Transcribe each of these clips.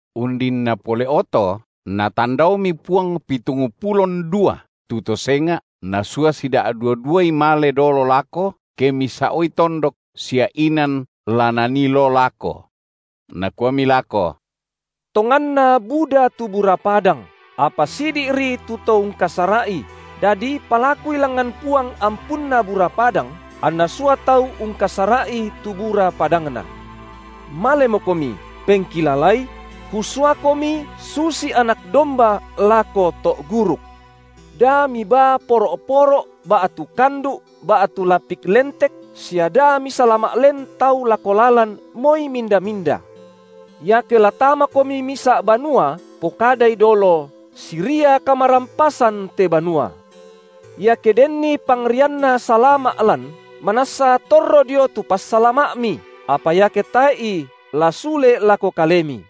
Undinna pole’oto Natandaomi Puang pitungpulo (ndua) tu to senga’, Nasua sida’dua-duai male dolo lako, ke misa’oi tondok sia inan la Nanii loo lako. Nakuami lako: Tonganna buda tu bura padang, apa sidi’ri tu to ungkasara’i, dadi palakui langngan Puang ampunna bura padang, anNa sua tau ungkasara’i tu bura padangNa. Malemokomi! Pengkilalai: Kusuakomi susi anak domba lako to’ guruk. Da mibaa poro’-poro’ ba’tu kandu’ ba’tu lapik lentek sia da misalama’ len tau lako lalan moi minda-minda. Iake la tamakomi misa’ banua, pokadai dolo: Siria kamarampasan te banua. Iake denni pangrianna salama’ lan, manassa torro dio tu passalama’mi, apa iake tae’i, la sule lako kalemi.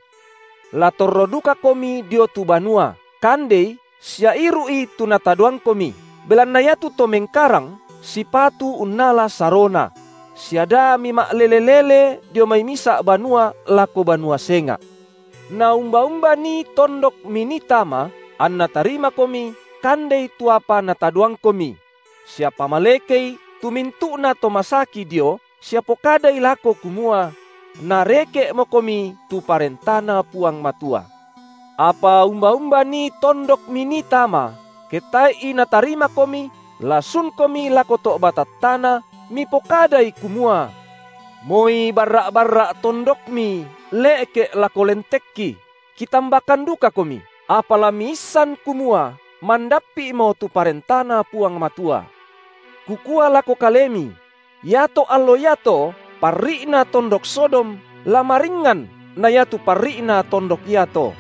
La torro dukakomi dio tu banua, kandei sia iru’i tu natadoangkomi, belanna iatu to mengkarang sipatu unnala sarona; sia da mima’lele-lele dio mai misa’ banua lako banua senga’. Na umba-umba nii tondok minii tama, anna tarimakomi, kandei tu apa natadoangkomi; sia pamalekei tu mintu’nato masaki dio sia pokadai lako kumua: nareke’mokomi tu ParentaNa Puang Matua. Apa umba-umba nii tondok minii tama, ke tae’i natarimakomi, la sunkomi lako to’ batattana, mipokadai, kumua: Moi barra’-barra’ tondokmi le’ke’ lako lentekki, kitambakan dukakomi, apa la miissan, kumua mandappi’mo tu ParentaNa Puang Matua. Kukua lako kalemi: iato allo iato parri’na tondok Sodom la maringngan na iatu parri’na tondok iato.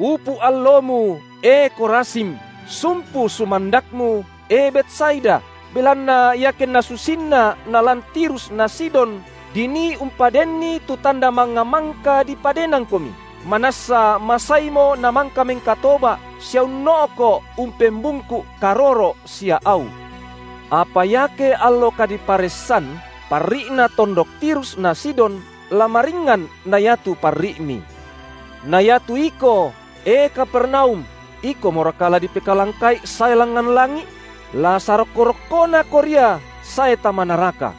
Upu’ allomu, e Khorazim, sumpu sumandakmu, e Betsaida, belanna iakenna susinna nalan Tirus na Sidon dinii umpadenni tu tanda mangnga, mangka dipadenangkomi, manassa masaimo namangka mengkatoba’ sia unno’ko’ umpembungku’ karoro’ sia au. Apa iake allo kadiparessan, parri’na tondok Tirus na Sidon la maringngan na iatu parri’mi. Na iatu iko, e Kapernaum, ikomoraka la dipekalangka’i sae langngan langi’? La sarokko-rokkonako ria sae tama naraka.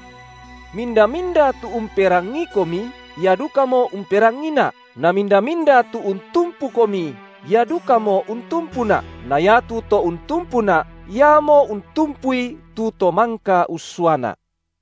Minda-minda tu umperangiikomi, ia dukamo umperangiiNa’ na minda-minda tu untumpukomi, ia dukamo untumpuNa’, na iatu to untumpuNa’, iamo untumpui tu To mangka ussuaNa’.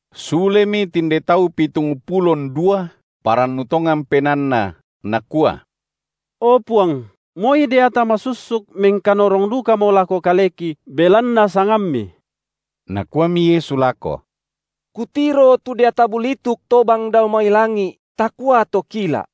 Sulemi tinde tau pitungpulo (ndua) parannu tongan penaanna, nakua: O Puang, moi deata masussuk mengkanorong dukamo lako kaleki, belanna sangamMi. Nakuami Yesu lako: Kutiro tu deata bulituk tobang dao mai langi’, takua tokila’.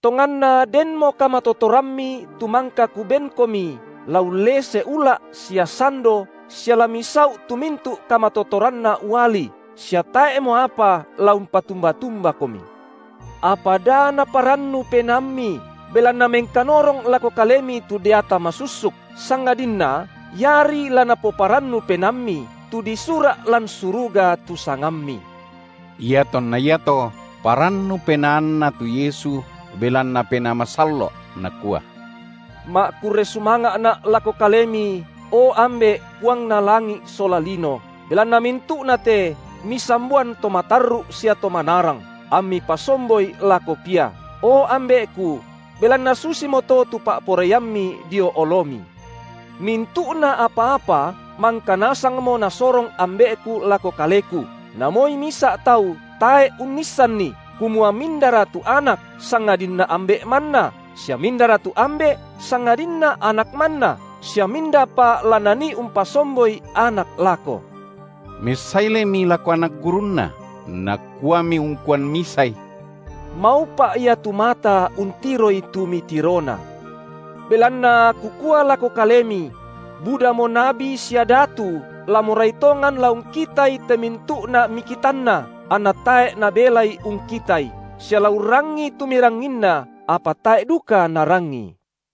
Tonganna denmo kamatotorammi tu mangka Kubenkomi la ullese ula’ sia sando sia la misau’ tu mintu’ kamatotoranna uali, sia tae’mo apa la umpatumba-tumbakomi. Apa da naparannu penaammi, belanna mengkanorong lako kalemi tu deata masussuk, sangadinna iari la napoparannu penaammi, tu disura’ lan suruga tu sangammi. Iatonna iato parannu penaanNa tu Yesu belanna Penaa Masallo’, nakua: Ma’kurre sumanga’Na’ lako Kalemi, O Ambe’, Puangna langi’ sola lino, belanna mintu’na te Misamboan to matarru’ sia to manarang, amMi pasomboi lako pia. O Ambe’Ku, belanna susimoto tu pa’poraiamMi dio oloMi. Mintu’na apa-apa mangka nasangmo Nasorong Ambe’Ku lako Kaleku, namoi misa’ tau tae’ unnissanni, kumua mindara tu Anak, sangadinna Ambe’ manna sia mindara tu Ambe’, sangadinna Anak manna sia mindapa la Nanii umpasomboi Anak lako. Messailemi lako anak gurunNa, Nakuami ungkuan misai: Maupa’ ia tu mata untiroi tu mitirona. Belanna Kukua lako kalemi: budamo nabi sia datu la morai tongan la ungkitai te mintu’na mikitanna anna tae’ nabelai ungkitai, sia la urrangii tu miranginna, apa tae’ duka narangii.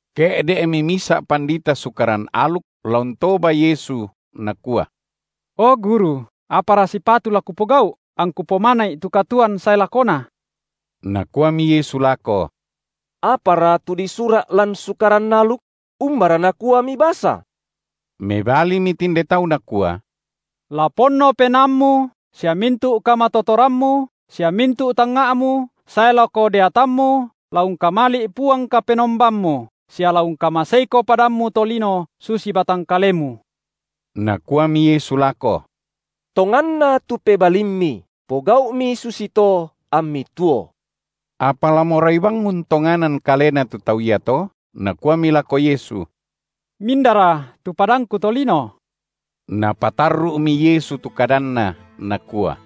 Ke’de’mi misa’ pandita Sukaran aluk la untoba Yesu, nakua: O Guru! apara sipatu la kupogau’, angku pomana’i tu katuoan sae lakona? Nakuami Yesu lako: Apara tu disura’ lan sura’ Sukaran aluk? Umbara nakua mibasa? Mebalimi tinde tau nakua: La ponno penaammu sia mintu’ kamatotorammu sia mintu’ tangnga’mu sae lako deatammu la ungkamali’ Puang Kapenombammu sia la ungkamaseiko padammu to lino susi batang kalemu. Nakuami Yesu lako: Tonganna tu pebalimmi. Pogau’mi susito ammi tuo. Apa la morai bang untonganan kalena tu tau iato, nakuami lako Yesu: Mindara tu padangku to lino? Napatarru’mi Yesu tu kadanNa, Nakua: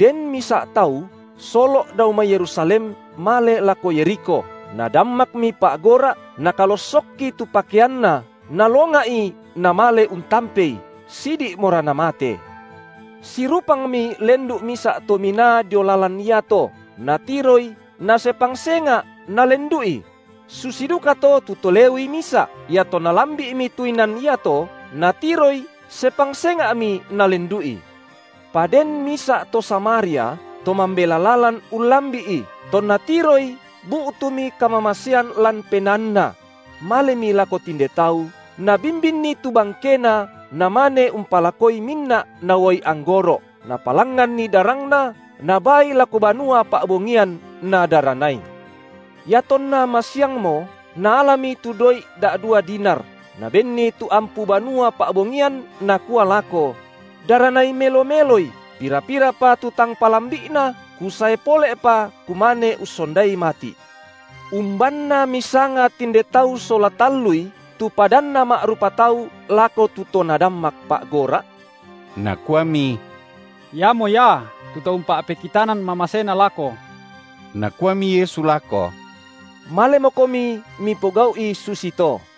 Den misa’ tau solo’ dao mai Yerusalem male lako Yerikho, nadammakmi pa’gora’ nakalossokki tu pakeanna, nalonga’i, namale untampei, sidi’mora namate. Sirupangmi lendu’ misa’ to minaa dio lalan iato, natiroi, nasepang senga’ nalendu’i; susi dukato tu to Lewi misa’, iatonna lambi’mi tu inan iato, natiroi, sepang senga’mi nalendu’i. Pa den misa’ to Samaria, to mambela lalan ullambi’i, tonna tiroi bu’tumi kamamasean lan penaanna; malemi lako tinde tau, nabimbinni tu bangkena namane umpalakoi minna’ na uai anggoro’, napalangnganni darangna, nabaai lako banua pa’bongian, nadaranai. Iatonna masiangmo, naalami tu doi’ da’dua dinar, nabenni tu ampu banua pa’bongian, nakua lako: Daranai melo-meloi, pira-pirapa tu tang palambi’na, kusae pole’pa kumane ussondai mati’. Umbanna misanga tinde tau sola tallui tu padanna ma’rupa tau lako tu to nadammak pa’gora’? Nakuami: Iamo ia tu to umpa’pekitanan mamasena lako. Nakuami Yesu lako: Malemokomi mipogau’i susito.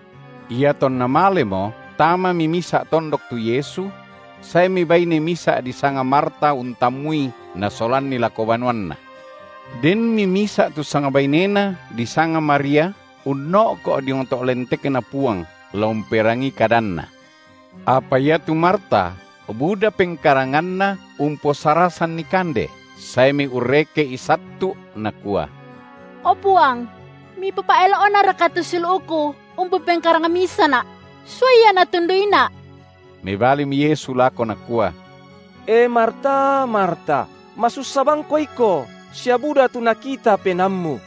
Iatonna malemo, tamami misa’ tondok tu Yesu; saemi baine misa’ disanga Marta untammui, nasolanni lako banuanna. Denmi misa’ tu sangbainena disanga Maria, uno’ko’ diong to’ lentekNa Puang, la umperangii kadanNa. Apa iatu Marta buda pengkaranganna umposarasanNi kande, saemi urreke’I sattu’, nakua: O Puang! Mipopa’elo’naraka tu siulu’ku umpopengkarang misana’? Suai ia natunduina’. Mebalimi Yesu lako, Nakua: E Marta, Marta, masussa bangko iko sia buda tu nakita penaammu.